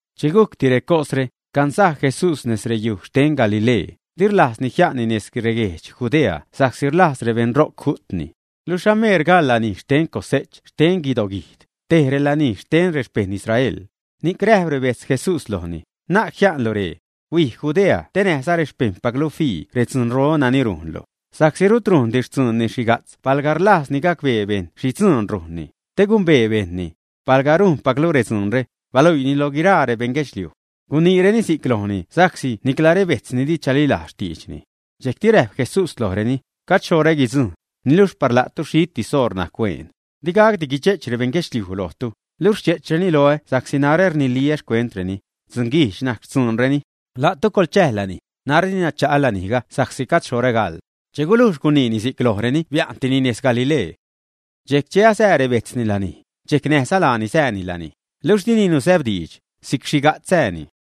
Che gujcti recosre, cansaj Jesús nez reyuj xten Galilee, di rlajzni jia'nni nez reguedx Judea sa'csi rlajz rebeṉ ro'c ju'tni. Luxh ameer gaḻ lanij xten cose'ch xten guidoguijd, te relanij xten rexpejṉ Israel. Ni'c räjp rebejtz Jesús lojni: ―Na'c jia'nlu ree. Huij Judea te näjza rexpejṉpaclu fii redzunro nani rujnlu. Sa'csi rut rujndi xtzuunni xhiga'tz palga rlajzni gacbee bejṉ xhi dzuun rujnni, te gumbee bejṉni. Palga rujnpaclu redzuunre, baluiini lo guiraa rebeṉ guedxliuj. Guniireni si'c lojni sa'csi nicla rebejtzni di chalilajz xtiidxni. Dxejcti räjp Jesús lojreni: ―Gajd xhoṟä guidzujṉ, niluxh par la'tu xhitis oṟ najc hueen. Di gacdi guidxe'ch rebeṉ guedxliuj lojtu, luxh rdxe'chreni loä sa'csi narä rniliä xcuentreni: dzunguijdx najc xtzuunreni. La'tu coḻchäj lanij; narä dina cha'a lanijga sa'csi gajd xhoṟä gaḻ. Che gulujx guniini si'c lojreni bia'ntini nez Galilee. Dxejcti che asää rebejtzni lanij, dxejc näjza laani sääni lanij, luxh dini nusäbdiidx, si'c xhiga'tz sääni.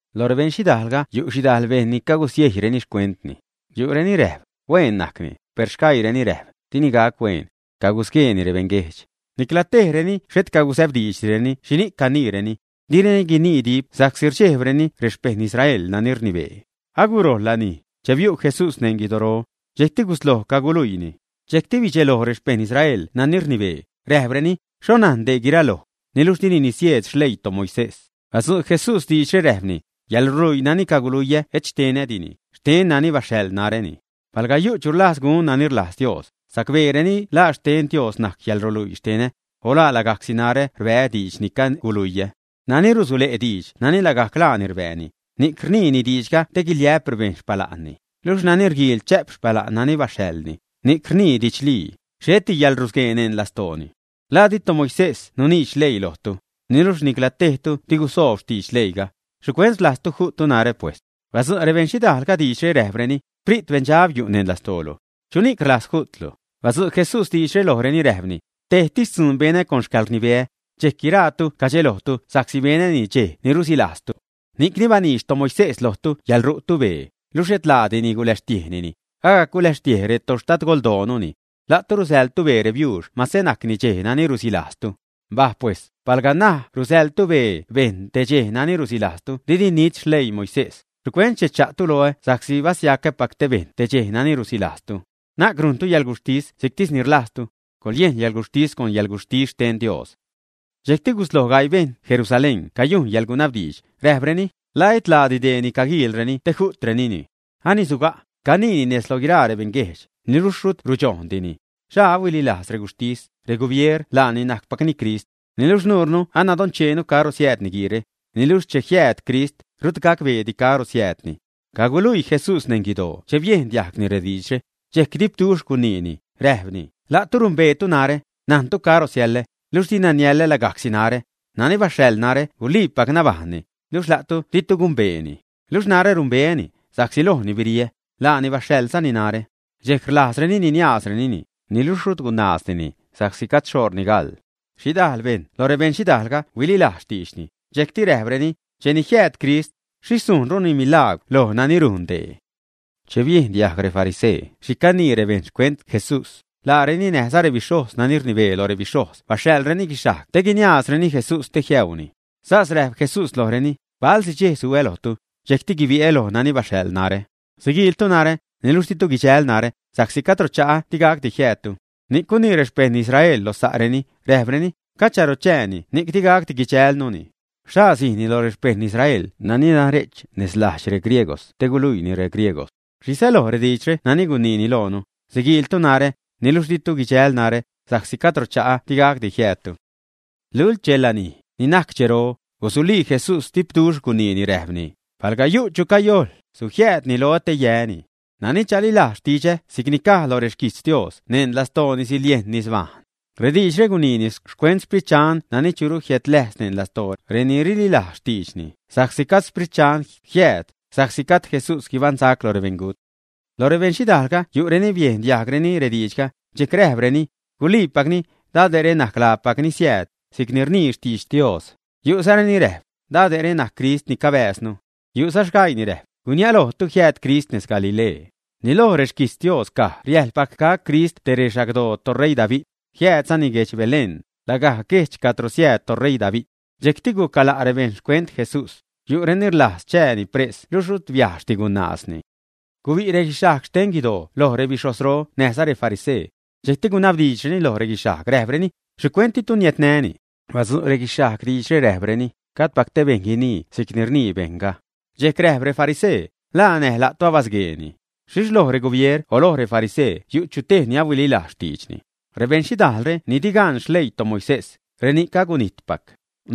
Lo rebejṉ xhidaalga yu' xhidajl bejṉ ni cagusiejyreni xcuentni. Yu'reni räjp: “Hueen najcni”, per sgaiireni räjp: “Dini gac hueen. Cagusgueeni rebeṉguejdx.” Nicla tejreni xhet casäbdiidxdireni xhini'c caniireni. Direni guinii dip sa'csi rdxejbreni rexpejṉ Israel nani rnibee. Agurojl lanij, che biu' Jesús neṉ guidoro. Dxejcti gusloj caguluiini. Dxejcti rdxeloj rexpejṉ Israel nani rnibee, räjpreni: ―¿Xho najn dee guiraloj, niluxh dini nisieed xleii toMoisés? Badzu' Jesús diidxre, räjpni: ―Yäḻruluii nani caluiyä et xtenädini, xten nani baxhaḻ naräni. Palga yu' chu rlajz gun nani rlajz Dios, sacbeeni la xten Dios najc reyäḻruluii xtenä, o la lagajcsi narä rbää́ diidx ni caguluiä. Nani rusule'ni diidx nani lagajc laani rbääni, ni'c rniini diidxga te guiliä'p rebejṉ xpala'nni, luxh nani rguiil chä'p xpala'n nani baxhaḻni, ni'c ni rnii didxlii, xheti yäḻrusguee neṉ lastooni. ¿La di toMoises nuniidx leii lojtu, ä? Niluxh nicla tejtu di gusoob xtidx leiiga. ¿Xhicuent rlajztu ju'ttu narä, pes? Badzu' rebeṉ xhidajlga diidxre, räjpreni: ―¡Xprit beṉdxab yu' lastoolu! ¿Chuni'c rlajz ju'tlu? Badzu' Jesús diidxre lojreni, räjpni: ―Tejtis dzuun benä con xcäḻrnibeä, dxejc guiraatu cadxelojtu sa'csi benäni dxej ni rusilajztu. Ni'cni baniidx toMoisés lojtu yäḻru'tu bee, luxh etlaadini guläxtiejnini, agac guläxtiej retoxtadgoldootuni. La'tu rusäḻtu bee rebiuux mase najcni dxej nani rusilajztu. Mbaj pes, palga rajc rusäḻtu bee bejṉ te dxej nani rusilajztu didi nit xleii Moisés, ¿xhicuent rdxe'chtu loä sa'csi basiacäpac te bejṉ te dxej nani rusilajztu, ä? Na'c rujntu yäḻguxhtis si'ctis ni rlajztu. Coḻyejn yäḻguxhtis con yäḻguxhtis xten Dios. Dxejcti gusloj gaii bejṉ Jerusalén cayujn yäḻgunabdiidx, räjpreni: ―¿La etlaadi dee ni caguiilreni te ju'trenini, ä? Ani asuga', caniini nez loj guiraa rebeṉguejdx, niluxh rut rudxojndini. ¿Xhaa ahuililajz reguxhtis, regubier laani najcpacni Crist, ä? Niluxh nuure nadoncheenu caro siääd niguiire, niluxh che jiääd Crist, rut gacbeedi caro siäädni. Caguluii Jesús neṉ guidoo che biejn diajgni rediidxre, dxejc dipduxh guniini, räjpni: ―La'tu numbeetu narä, najntu caro siälä; luxh dina niälä lagajcsi narä; nani baxhaḻ narä guliipac nabajṉni, luxh la'tu ditu gumbeeni. Luxh narä numbeäni, sa'csi lojni biriä, laani baxhaḻzani narä. Dxejc rlajzreni niniaazrenini, niluxh rut gunaazdini, sa'csi gajd xhoṟni gaḻ. Xhidajl bejṉ lo rebeṉ xhidajlga huililajz xtiidxni, dxejcti räjpreni: ―Cheni jiääd Crist, ¿xhixh sujnruni milagwr loj nani rujn dee, ä? Che biejn diajg refarisee xhi canii rebejṉ xcuent Jesús, laareni näjza rebixhojz nani rnibee lo rebixhojz baxhaḻreni guixhajg te guiniaazreni Jesús te jiäuuni. Sas räjp Jesús lojreni: ―Bale'si dxej su'ä lojtu, dxejcti guibi'ä loj nani baxhaḻ narä. Siguiiltu narä, niluxh ditu guidxäl narä, sa'csi cadro cha'ä digacdi jiäädtu. Ni'c gunii rexpejṉ Israel lo sa'reni; räjpreni: ―¿Cacharo chääni ni'c di gacdi guidxälnuni? ¿Xhaa sijni loj rexpejṉ Israel nani nare'ch nez lajdx regriegos te guluiini regriegos? ¿Xhi säloj diidxre nani guniini loonu: “Siguiiltu narä, niluxh ditu guidxäl narä, sa'csi cadro cha'ä di gacdi jiäädtu”? Lult dxe lanij, ni najc dxero, gusulii Jesús dipduxh guniini, räjpni: ―Palga yu' chu cayojḻ, sujiäädni loä te yäni. Nani chalilajz xtidxä si'cni caj lo rexquijtz Dios neṉ lastoolini siliejn nisnabajṉ. Rediidxre guniini xcuent Sprit Dxan nani churu jiädläjz neṉ lastoo reni rililajz xtiidxni, sa'csi gajd Sprit Dxan jiääd, sa'csi gajd Jesús guibaṉsac lo rebeṉgut. Lo rebeṉ xhidajlga yu' reni biejn diajgreni rediidxga, dxejc räjpreni: ―Guliipacni, dade're najc laapac ni siääd, si'c ni rnii xtidx Dios. Yu'zareni räjp: ―Dade're najc Crist ni cabääznu. Yu'za sgaii ni räjp: ―Gurniälojtu jiääd Crist nez Galilee. Ni loj rexquijtz Dios caj riäjḻpac gac Crist te rexagdoo toṟeii David, jiäädzani guedx Belén, lagajc guejdx cadro siääd toṟeii David. Dxejcti gucgala' rebejṉ xcuent Jesús. Yu'reni rlajz chääni pres luxh rut biajxdi gunaazni. Gubi' reguixhajg xten guidoo loj rebixhojzro näjza refarisee. Dxejcti gunabdiidxreni loj reguixhajg, räjpreni: ―¿Xhicuent ditu niädnäni? Badzu' reguixhajg diidxre, räjpreni: ―¡Gajdpac te bejṉ guinii si'cni rnii bejṉga! Dxejc räjp refarisee: ―¿La näj la'tu abasgueeni, ä? ¿Xhixh loj regubier o loj refarisee yu' chu tej ni ahuililajz xtiidxni, ä? Rebeṉ xhidajlre ni di gan xleii toMoisés, reni'c agunijtpac.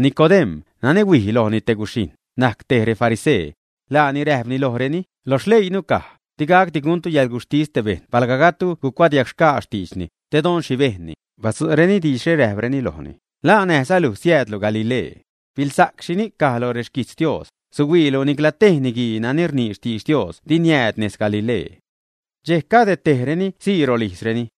Nicodem̲, nani huij lojni te guxhijṉ, najc te refarisee. Laani räjpni lojreni: ―Lo xleiinu caj: digacdi guntu yäḻguxhtis te bejṉ palga gajdtu gucuadiagxgaa xtiidxni, te don xhi bejnni. Badzu'reni diidxre räjpreni lojni: ―¿La näjza luj siäädlu Galilee, ä? Biḻsa'c xhi caj lo xquijtz Dios, suhuiilu nicla tej niguii nani rnii xtidx Dios di jiääd nez Galilee. Dxejc cade tejreni sii rolijzreni.